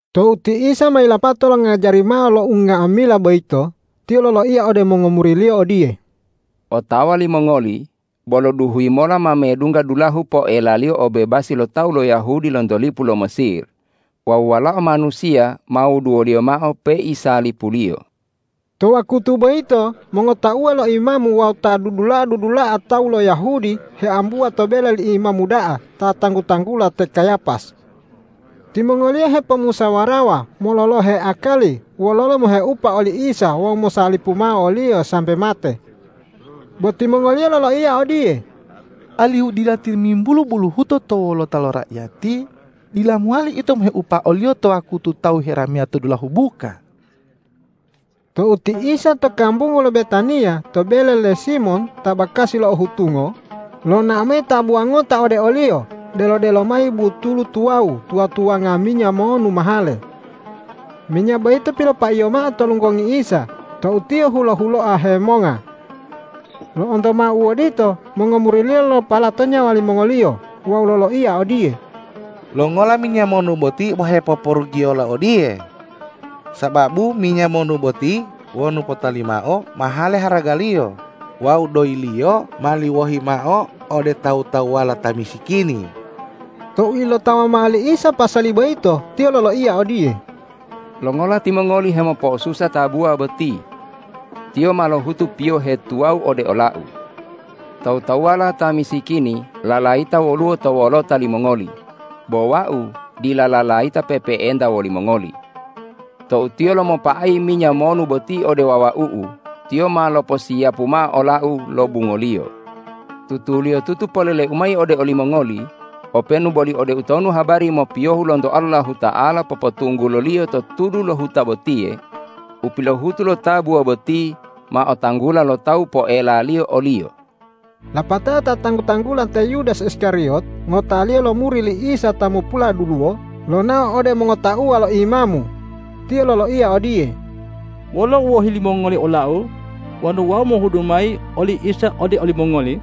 Tou ti Isa ma yilapato longajari mao lo unga'amila boyito, Tiyo loloiya ode mongomuri-Liyo odiye, ”Otawa limongoli bolo duhuyi mola ma medungga dulahu poelaliyo obebasi lo tawu lo Yahudi lonto lipu lo Mesir wawu Walao Manusiya ma wuduwoliyo mao peisalipuliyo!” To wakutu boyito mongotauwa lo imamu wawu ta dudula'a- dudula'a tawu lo Yahudi heambuwa to bele li imamu da'a ta tanggu-tanggula te Kayapas. Timongoliyo hepomusawarawa mololohe akali wololo moheupa oli Isa wawu mosalipu mao o-Liyo sambe mate. Bo timongoliyo loloiya odiye,”Alihu dila timimbulu buluhuto to wolota lo raiyati, dila mowali ito moheupa o-Liyo to wakutu tawu herameya to dulahu buka.” Tou ti Isa to kambungu lo Betaniya to bele le Simon ta bakasi lo u ohutungo, lonao mayi tabuwa ngota ode o-Liyo delo-delo mayi butulu tuwawu tuwa-tuwanga minya monu mahale. Minya boyito pilopaiyo mao to lunggongi Isa tou Tiyo hulo-huloa hemonga. Lo'onto mao u odito mongomuri-Liyo lopalato nyawa limongoliyo wawu loloiya odiye,”Longola minya monu boti bo hepoporugiyola odiye? Sababu minya monu boti wonu potali mao mahale haragaliyo wawu doyiliyo mali wohi mao ode tawu-tawuwala ta misikini.” Tou ilotawa mao li Isa pasali boyito, Tiyo loloiya odiye,”Longola timongoli hemopo'osusa tabuwa boti? Tiyo ma lohutu piyohe tuwawu ode ola-U. Tawu-tawuwala ta misikini lalayita woluwo to wolota limongoli, bo Wau dila lalayita pe'epe'enta wolimongoli. Tou tiyo lomopa'ayi minya monu boti ode wawau-U, tiyo ma loposiyapu mao ola-U lobungoliyo. Tutuliyotutu polele-U mayi ode olimongoli: Openu boli ode utonu habari mopiyohu lonto Allahuta'ala popotungguloliyo to tudu lo huta botiye, u pilohutu lo tabuwa boti ma otanggula lo tawu poelaliyo oliyo.” Lapatao ta tanggu-tanggula te Yudas Iskariyot ngotaliyo lo muri li Isa ta mopuladuluwo, lonao ode mongotauwa lo imamu. Tiyo loloiya odiye,”Wolo u wohi limongoli olau wonu wau mohudu mayi oli Isa ode olimongoli?”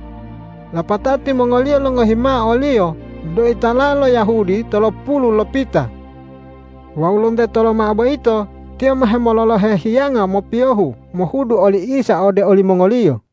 Lapatao timongoliyo longohi mao oliyo doyi tala'a lo Yahudi tolopulu lopita. Wawu lonteto lomao boyito tiyo ma hemololohe hiyanga mopiyohu mohudu oli Isa ode olimongoliyo.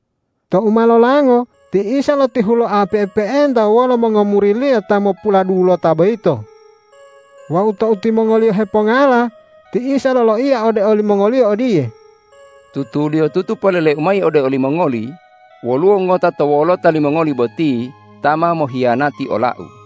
Tou ma lolango ti Isa lotihuloa pe'epe'enta wolo mongomuri-Liyo ta mopuladulota boyito. Wawu tou timongoliyo hepongala, ti Isa loloiya ode limongoliyo odiye,”Tutuliyotutu polele-U mayi ode olimongoli: Woluwo ngota to wolota limongoli boti ta ma mohiyanati ola-U.”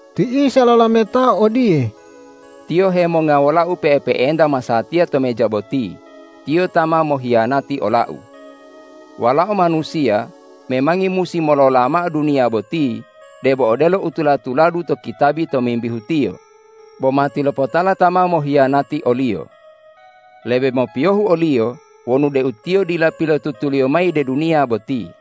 Ti Isa lolametao odiye,”Tiyo hemonga wola-U pe'epe'enta masatiya to meja boti, tiyo ta ma mohiyanati ola-U. Walao Manusiya memangi musi molola mao duniya boti debo odelo u tula-tuladu to kitabi tomimbihu Tiyo, bo matilopotala ta ma mohiyanati o-Liyo. Lebe mopiyohu oliyo wonu deu tiyo dila pilotutuliyo mayi de duniya boti.”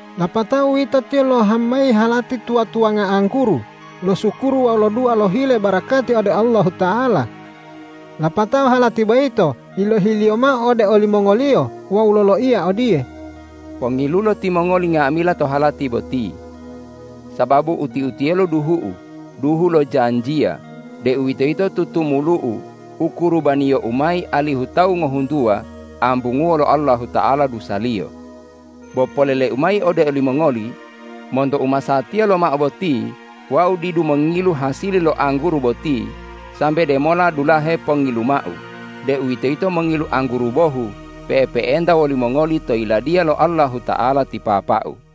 Lapatao uwito Tiyo lohama mayi halati tuwa-tuwanga angguru, losukuru wawu lodua lohile barakati ode Allahuta'ala. Lapatao halati boyito yilohi-Liyo mao ode olimongoliyo wawu loloiya odiye,”Pongilulo timongoli nga'amila to halati boti. Sababu uti-utiyelo duhu-U, duhu lo janjiya, deuwitoyito tutumulu-U u kurubaniyo-U mayi alihu tawu ngohuntuwa ambunguwo lo Allahuta'ala dusaliyo. Bo polele-U mayi ode olimongoli: Monto umasatiya lomao boti Wau didu mongilu hasili lo angguru boti sambe demola dulahe pongiluma-U, deuwitoyito mongilu angguru bohu, pe'epe'enta woli mongoli to Yiladiya lo Allahuta'ala ti Papa-U.”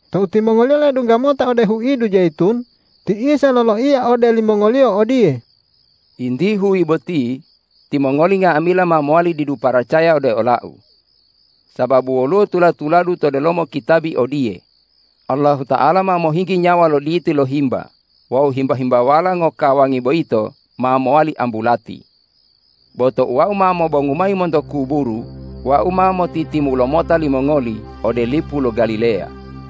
Tou timongoliyo ledungga mota ode huidu Jayitun, ti Isa loloiya ode limongoliyo odiye,”Yinti huyi boti timongoli nga'amila ma mowali didu paracaya ode ola-U. Sababu woluwo tula-tuladu to delomo kitabi odiye, ’Allahuta'ala ma mohinggi nyawa lo diti lo himba wawu himba-himbawala ngokawangi boyito ma mowali ambulati.’ Bo tou Wau ma mobongu mayi monto kuburu, Wau ma motitimulo mota limongoli ode lipu lo Galileya.”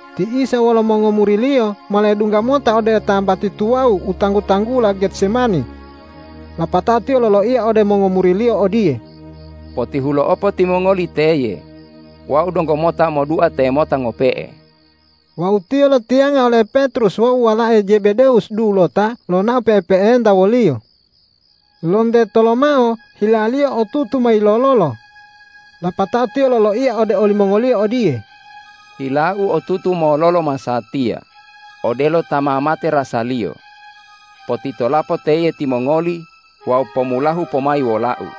Ti Isa wolo mongomuri-Liyo ma ledungga mota ode tambati tuwawu u tanggu-tanggula Getsemani. Lapatao Tiyo loloiya ode mongomuri-Liyo odiye,”Potihulo'opo timongoli teye. Wau donggo mota modua temota ngope'e.” Wawu Tiyo lotiyanga ole Petrus wawu walae Jebedewus dulota lonao pe'epe'enta wo-Liyo. Lonteto lomao hila-Liyo otutu ma yilololo. Lapatao Tiyo loloiya ode olimongoliyo odiye,”Hila-U otutu mololo masatiya, odelo ta ma mate rasaliyo. Potitolapo teye timongoli wawu pomulahu pomayi wola-U.”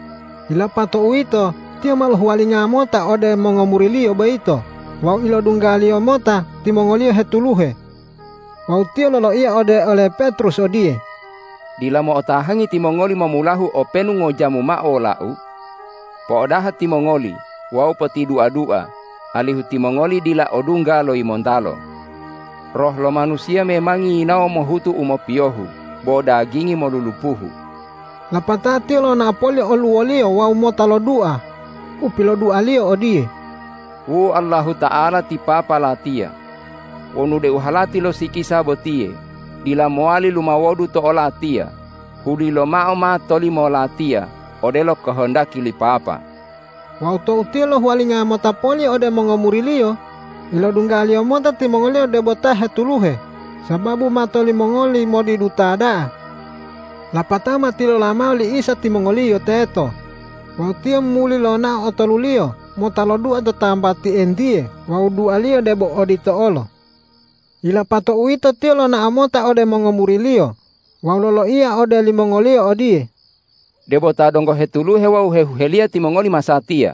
Yilapato uwito Tiyo ma lohuwalinga mota ode mongomuri-Liyo boyito wawu ilodungga-Liyo mota timongoliyo hetuluhe. Wawu Tiyo loloiya ode ole Petrus odiye,”Dila mo'otahangi timongoli momulahu openu ngojamu mao wola-U? Po'odaha timongoli wawu potidua-dua alihu timongoli dila odungga lo yimontalo. Roh lo manusiya memangi yinawo mohutu u mopiyohu bo dagingi molulupuhu.” Lapatao Tiyo lonao poli oluwoliyo wawu mota lodua, upilodua-Liyo odiye,”Wu Allahuta'ala ti Papa Latiya, wonu deu halati lo sikisa botiye dila mowali lumawodu to o-Latiya, huli lomao ma tolimo Latiya odelo kohondaki li Papa!” Wawu tou Tiyo lohuwalinga mota poli ode mongomuri-Liyo, ilodungga-Liyo mota timongoliyo debo ta hetuluhe, sababu mato limongoli modiduta da'a. Lapatao ma tilola mao li Isa timongoliyo teto wawu Tiyo muli lonao otoluliyo mota lodua to tambati entiye wawu dua-Liyo debo odito olo. Yilapato uwito Tiyo lonao mota ode mongomuri-Liyo wawu loloiya ode limongoliyo odiye,”Debo ta donggo hetuluhe wawu hehuheliya timongoli masatiya.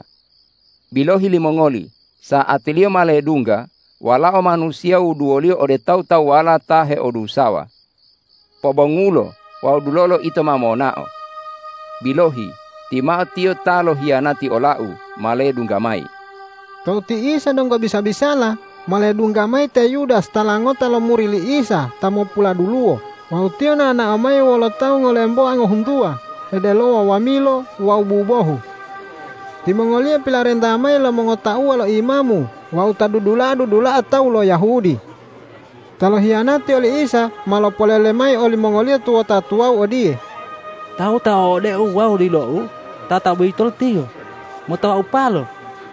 Bilohi limongoli, sa'atiliyo ma ledungga Walao Manusiya wuduwoliyo ode tawu-tawuwala ta heodusawa. Pobongulo wawu dulolo ito ma monao. Bilohi, timao tiyo ta lohiyanati ola-U ma ledungga mayi.” Tou ti Isa donggo bisa-bisala, ma ledungga mayi te Yudas tala ngota lo muri li Isa ta mopuladuluwo wawu tiyo nao-nao mayi wolo tawu ngolemboa ngohuntuwa hedelowa wamilo wawu bubohu. Timongoliyo pilarenta mayi lo mongotauwa lo imamu wawu ta dudula'a-dudula'a tawu lo Yahudi. Ta lohiyanati oli Isa ma lopolele mayi olimongoliyo tuwota tuwawu odiye,”Tawu ta o'odeu wawu dilou tataboyitolo Tiyo, mota waupalo.”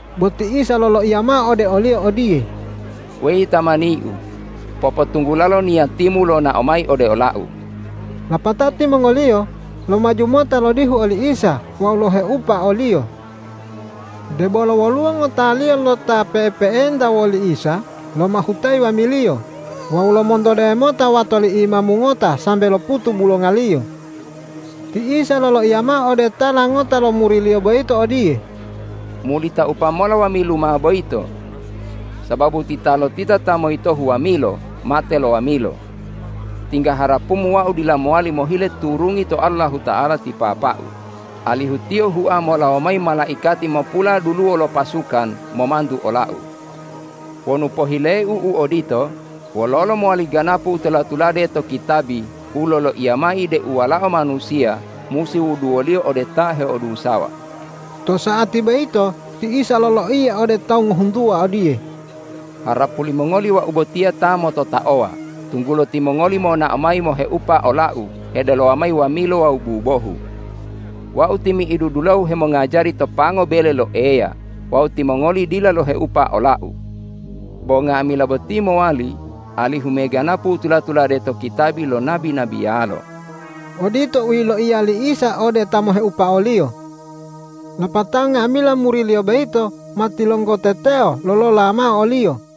Bo ti Isa loloiya mao ode oliyo odiye,”Weyi tamani-U, popotunggulalo niyatimu lonao mayi ode ola-U.” Lapatao timongoliyo lomaju mota lodihu oli Isa wawu loheupa o-Liyo. Debolo woluwo ngotaliyo lo ta pe'epe'enta woli Isa lomahutayi wamiliyo wawu lomontode mota wato li imamu ngota sambe loputu bulongaliyo. Ti Isa loloiya mao ode tala ngota lo muri-Liyo boyito odiye,”Muli taupa mola wamiluma boyito. Sababu titalotita ta moyitohu wamilo mate lo wamilo. Tingga harapumu Wau dila mowali mohile turungi to Allahuta'ala ti Papa-U, alihu Tiyo hua molawo mayi malaikati mopuladuluwo lo pasukan momantu ola-U. Wonu pohile-U u odito, wololo mowali ganapu u tula-tulade to kitabi u loloiya mayi deu Walao Manusiya musi wuduwoliyo ode ta heodusawa?” To sa'ati boyito ti Isa loloiya ode tawu ngohuntuwa odiye,”Harapu limongoli Wau botiya ta mototaowa, tunggulo timongoli monao mayi moheupa ola-U hedelowa mayi wamilo wawu bubohu. Wau timi'idu dulahu hemongajari to pango bele lo Eya wawu timongoli dila loheupa ola-U. Bo nga'amila boti mowali alihu me ganapu u tula-tulade to kitabi lo nabi-nabiyalo.” Odito u yiloiya li Isa ode ta moheupa o-Liyo. Lapatao nga'amila muri-Liyo boyito ma tilonggoteteo lolola mao o-Liyo.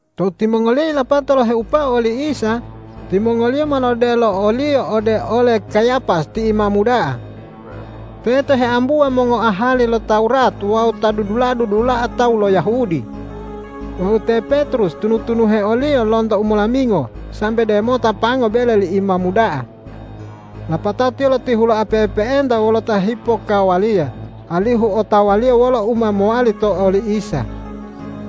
Tou timongoliyo yilapato loheupao oli Isa, timongoliyo ma lodelo o-Liyo ode ole Kayapas ti imamu da'a. Teto heambuwa mongoahali lo Tawurat wawu ta dudula'a-dudula'a tawu lo Yahudi. Wawu te Petrus tunu-tunuhe o-Liyo lonto umolamingo sambe demota pango bele li imamu da'a. Lapatao tiyo lotihuloa pe'epe'enta wolo ta hipokkawaliya, alihu otawaliyo wolo u ma mowali to oli Isa.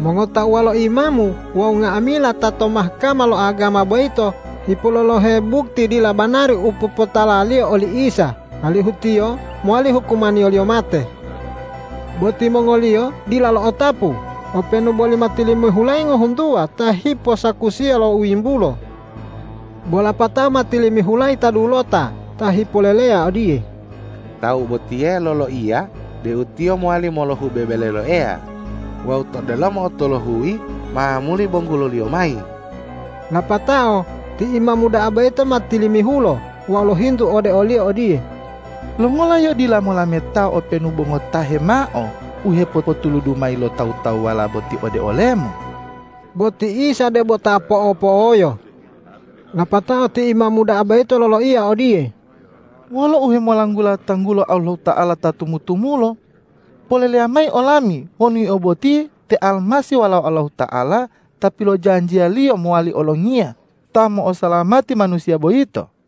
Mongotauwa lo imamu wawu nga'amila ta to Mahkama lo agama boyito hipololohe bukti dila banari u popotalaliyo oli Isa, alihu Tiyo mowali hukumaniyoliyo mate. Bo timongoliyo dila lo'otapu, openu boli ma tilimihulayi ngohuntuwa ta hiposakusiya lo u yimbulo. Bo lapatao ma tilimihulayi ta dulota ta hipoleleya odiye,”Tawu botiye loloiya deu Tiyo mowali molohube bele lo Eya wawu to delomo u tolohuyi ma muli bongulo-Liyo mayi.” Lapatao ti imamu da'a boyito ma tilimihulo wawu lohintu ode o-Liyo odiye,”Longola Yio dila molameta openu bo ngotahe mao u hepopotuludu mayi lo tawu-tawuwala boti ode ole-Mu?” Bo ti Isa debo ta po'opo'oyo. Lapatao ti imamu da'a boyito loloiya odiye,”Wolo uhemolanggula tanggulo Allahuta'ala ta tumu-tumulo, poleleya mayi olami wonu Yio boti te Almasih Walao Allahuta'ala ta pilojanjiya-Liyo mowali olongiya ta mo'osalamati manusiya boyito?”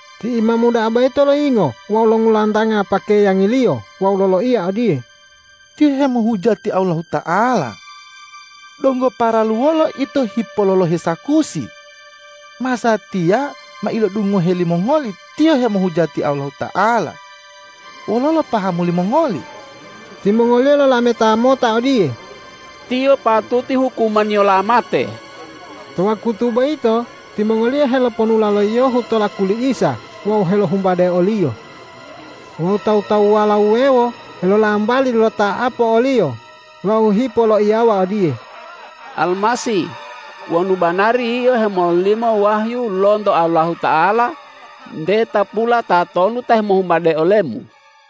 Ti imamu da'a boyito loyingo wawu longulantanga pakeyangiliyo wawu loloiya odiye,”Tiyo hemohujati Allahuta'ala. Donggo paralu wolo ito hipololohe sakusi? Masatiya ma ilodungohe limongoli Tiyo hemohujati Allahuta'ala. Wololo pahamu limongoli?” Timongoliyo lolameta mota odiye,”Tiyo patuti hukumaniyola mate!” To wakutu boyito timongoliyo heloponula lo yiyohu to laku li Isa wawu helohumbade o-Liyo. Wawu tawu-tawuwala wuwewo helolambali lota'apo o-Liyo wawu hipoloiyawa odiye,”Almasih, wonu banari Yio hemololimo wahyu lonto Allahuta'ala, nte tapula tatonu ta hemohumbade ole-Mu?”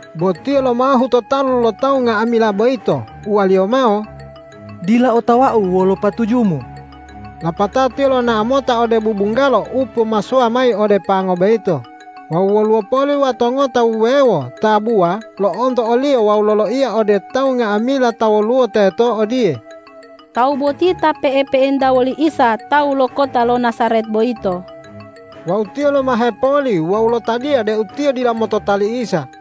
Bo tiyo lomahu to talu lo tawu nga'amila boyito, uwaliyo mao,”Dila otawau wolo patujumu.” Lapatao tiyo lonao mota ode bubunggalo u pomasowa mayi ode pango boyito wawu woluwo poli wato ngota wuwewo tabuwa lo'onto oliyo wawu loloiya ode tawu nga'amila ta woluwo teto odiye,”Tawu boti ta pe'epe'enta woli Isa tawu lo kota lo Najaret boyito.” Wawu tiyo lomahe poli wawu lotadiya deu tiyo dila motota li Isa.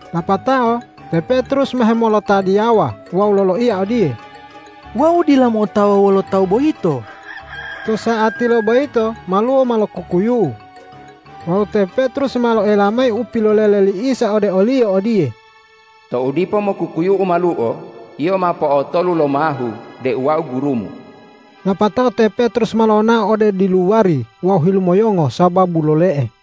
Lapatao te Petrus ma hemolotadiyawa wawu loloiya odiye,”Wau dila mo'otawa wolo tawu boyito.” To sa'atilo boyito maluo ma lokukuyu'u. Wawu te Petrus ma lo'oela mayi upilolele li Isa ode oliyo odiye,”Tou dipo mokukuyu'u maluo, yio ma po'otolu lomahu deu Wau gurumu.” Lapatao te Petrus ma lonao ode diluwari wawu hilumoyongo sababu lole'e.